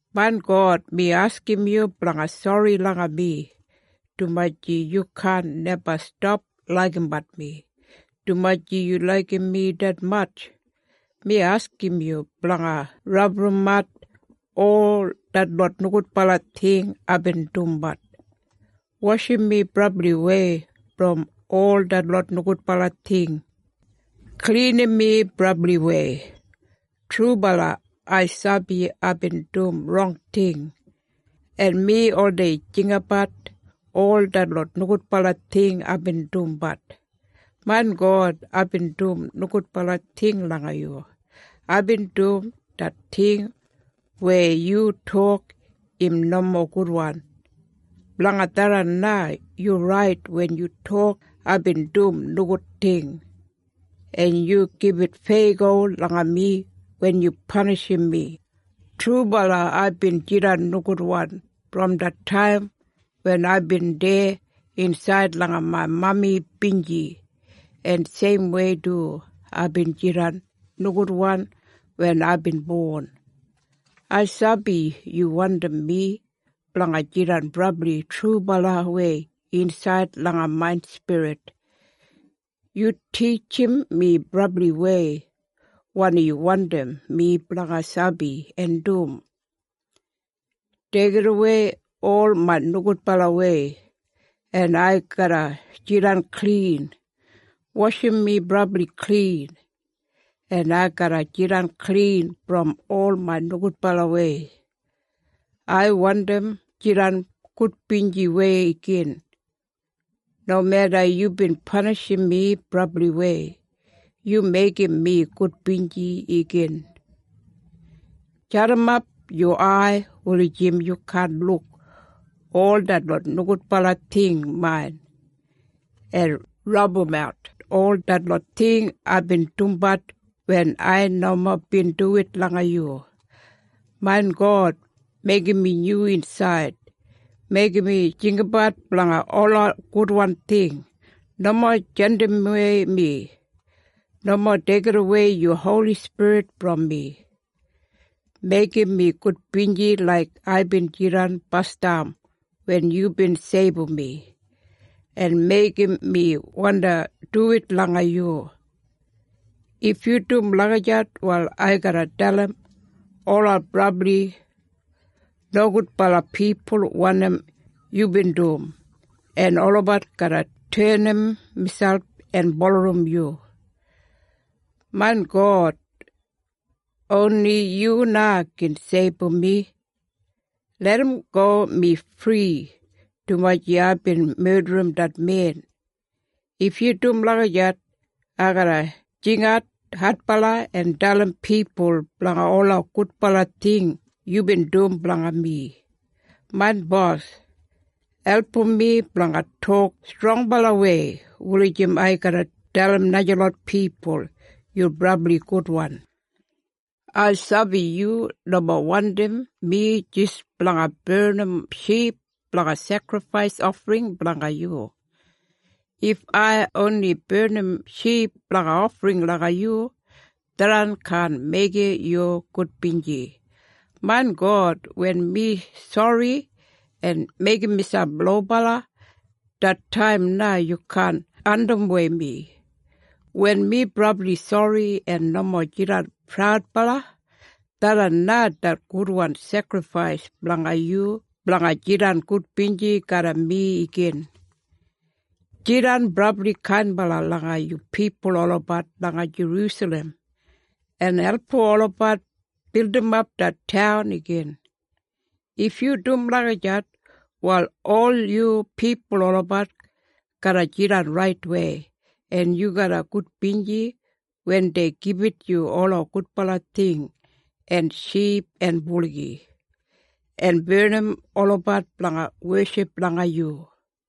Main God, mi askim yu blanga sori langa mi, dumaji yu kaan neba stap laigimbat mi! Dumaji yu laigim mi detmatj, mi askim yu blanga rabumat ol detlot nogudbala ting aibin dumbat. Washim mi brabliwei brom ol detlot nogudbala ting. Klinim mi brabliwei. Trubala, ai sabi aibin dum rong ting, en mi oldei jinggabat ol detlot nogudbala ting aibin dumbat. Main God, aibin dum nogudbala ting langa yu. Aibin dum det ting weya yu tok im nomo gudwan. Blanga tharran na, yu rait wen yu tok aibin dum nogud ting, en yu gibit feyago langa mi wen yu panishim mi. Trubala aibin jidan nogudwan brom det taim wen aibin deya insaid langa main mami binji, en seimwei du aibin jidan nogudwan wen aibin bon. Ai sabi yu wandim mi blanga jidan brabli trubalawei insaid langa main spirit. Yu titjim mi brabliwei wanim yu wandim mi blanga sabi en dum. Deigidawei ol main nogudbalawei, en ai garra jidan klin. Washim mi brabli klin, en ai garra jidan klin brom ol main nogudbalawei. Ai wandim jidan gudbinjiwei igin! Nomeda yubin panishim mi brabliwei, yu meigim mi gudbinji igin! Jadimap yu ai, wulijim yu kaan luk ol detlot nogudbala ting main, en rabumat ol detlot ting aibin dumbat wen ai nomo bin duwit langa yu. Main God, meigim mi nyu insaid. Meigim mi jinggabat blanga ola gudwan ting. Nomo jandimwei mi. Nomo deigidawei yu holi spirit brom mi. Meigim mi gudbinji laik aibin jidan basdam wen yubin seibum mi. En meigim mi wandi duwit langa yu. If yu dum lagijat, wal ai garra dalim ola brabli nogudbala pipul wanim yubin dum, en olabat garra tenim miselp en bulurrum yu. Main God, oni yu na gin seibum mi. Larramgo mi fri dumaji aibin medrim det men. If yu dum lagijat, ai garra jingat adbala en dalim pipul blanga ola gudbala ting yubin dum blanga mi. Main bos, album mi blanga tok strongbalawei, wulijim ai garra dalim najalot pipul yu brabli gudwan. Ai sabi yu nomo wandim mi jis blanga barnim ship blanga sekrifais ofring blanga yu. If ai oni barnim ship blanga ofring langa yu, tharran kaan meigim yu gudbinji. Main God, wen mi sori en meigim miselp lobala, det taim na yu kaan andimwei mi. Wen mi brabli sori en nomo jidan praudbala, tharran na det gudwan sekrifais blanga yu blanga jidan gudbinji garram mi igin. Jidan brabli kainbala langa yu pipul olabat langa Jerusalem, en album olabat bildimap det taun igin. If yu dum lagijat, wal ol yu pipul olabat garra jidan raitwei, en yu garra gudbinji wen dei gibit yu ola gudbala ting, en ship en buligi, en barnim olabat blanga weship langa yu.